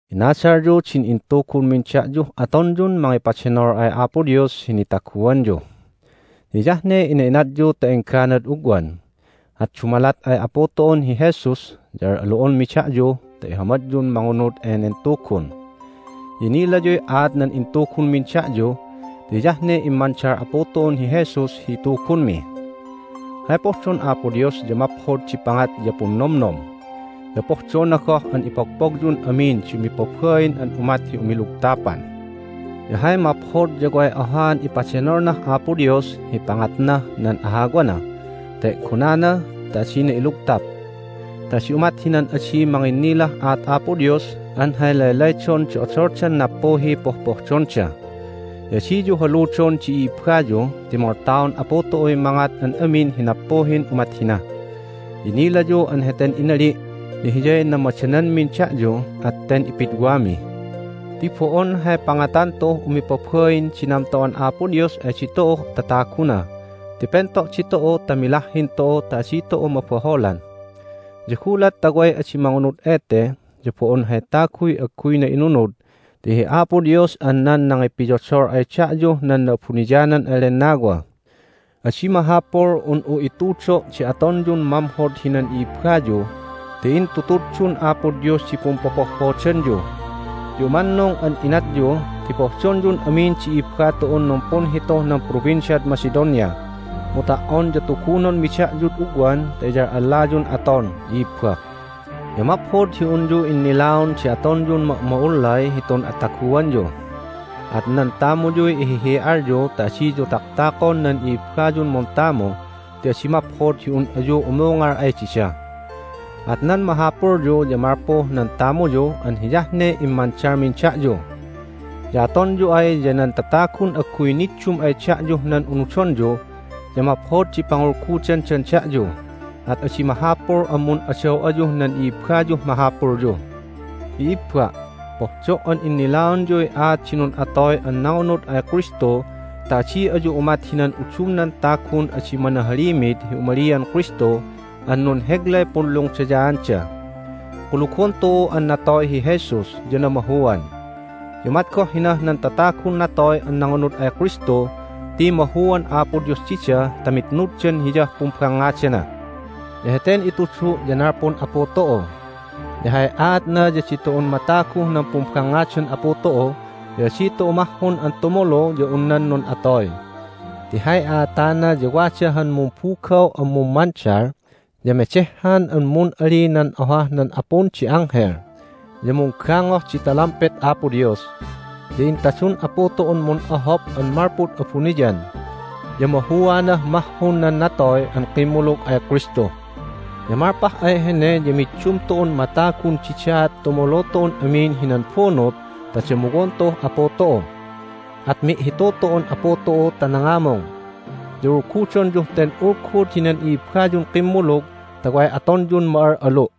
Inadalyu din intugunmin da'yuh atonyun mangipadenol ay Apo Dios hi nitaguanyu. Ya hiyah ne ina'inatyu ta engganad ugwan, at dumalat ay Apu tu'un hi Jesus ya al'alu'onmi da'yu ta ihamadyun mangunud enen Tugun. Ya inilayuy aat nan intugunmin da'yu ti hiyah ne immandal Apu tu'un hi Jesus hi itugunmi. Hay pohdon Apo Dios ya maphod di pangat ya punnomnom, ya pohdona goh an ipogpogyun amin di umipabain an umat hi umilugtapan. Ya hay maphod ya way ohaan ipadenolnah Apo Dios hi pangatnah nan ahawana ta e'gonana ta adina ilugtap, ta adi umat hinan adi manginnilah aat Apo Dios an hay laylaydon di odoldan nappuhiy pohpohdonda. Ya adiyu haludon di i'ibbayu ti moltaon Apu tu'uy mangat an amin hi nappuhin umat hina. Ya inilayu an heten inali' ya hiyay namadananmin da'yu, at ten ipidwami. Ti bo'on hay pangatan tu'uh umipabain di namto'an Apo Dios ay ditu'uh tataguna ti pento' ditu'u ta milahhin tu'u ta adi tu'u mabaholan. Ya gulat ta way adi mangunud ete ya bo'on hay taguy agguyna inunud ti hi Apo Dios an nan nangipiyodol ay da'yuh nan Na'abuniyanan an Lennawa. Adi mahapul un'u itudo' di atonyun mamhod hinan i'ibbayu ti intutuddun Apo Dios di pumpopohhodanyu! Ya umannung an inatyu ti pohdonyun amin di i'ibba tu'un numpunhituh nan Provinciad Macedonia. Mu ta"on ya tugunonmi da'yud ugwan ta iyal'allayun aton, i'ibba. Ya maphod hi unyu innilaon di atonyun ma'ma'ullay hitun ataguanyu. At nan tamuyuy ihihi'alyu ta adiyu taktakon nan i'ibbayun muntamu ti adi maphod hi un ayu umungal ay dida. At nan mahapulyu ya malpuh nan tamuyu an hiyah ne immandalmin da'yu. Ya atonyu ay ya nan tatagun agguy niddum ay da'yuh nan unudonyu ya maphod di pangulgudandan da'yu, at adi mahapul an mun'adaw ayuh nan i'ibbayuh mahapulyu. I'ibba', pohdo' an innilaonyuy aat di nun'atoy an nangunud ay Kristu ta adi ayu umat hinan udumnan tagun adi manahalimid hi umalian Kristu an nunheglay punlungdayaanda. Kulugon tu'u an natoy hi Jesus ya namahuan. Ya umat goh hinah nan tatagun natoy an nangunud ay Kristu ti mahuan Apo Dios dida ta mitnuddan Hiyah pumbangngadana. Ya heten itudu' ya nalpun Apu tu'u. Ya hay aatna ya ditu'un mataguh nan pumbangngadan Apu tu'u ya adi tu'u mahhun an tumulu ya un nan nun'atoy. Ti hay a'atana ya wada han mumbugaw an mummandal, ya medehhan an mun'ali nan ohah nan apun di anghel, ya munggangoh di talampet Apo Dios, ya intadun Apu tu'un mun'ohop an malpud abuniyan! Ya mahuanah mahhun nan natoy an kimmulug ay Kristu. Ya malpah ay hene ya middum tu'un matagun didaat tumulu tu'un amin hinan bunut ta damuwon tu'uh Apu tu'u. At mi'hitu tu'un Apu tu'u ta nangamung. Ya ulgudonyuh ten ulgud hinan i'ibbayun kimmulug ta way atonyun ma'al'alu'.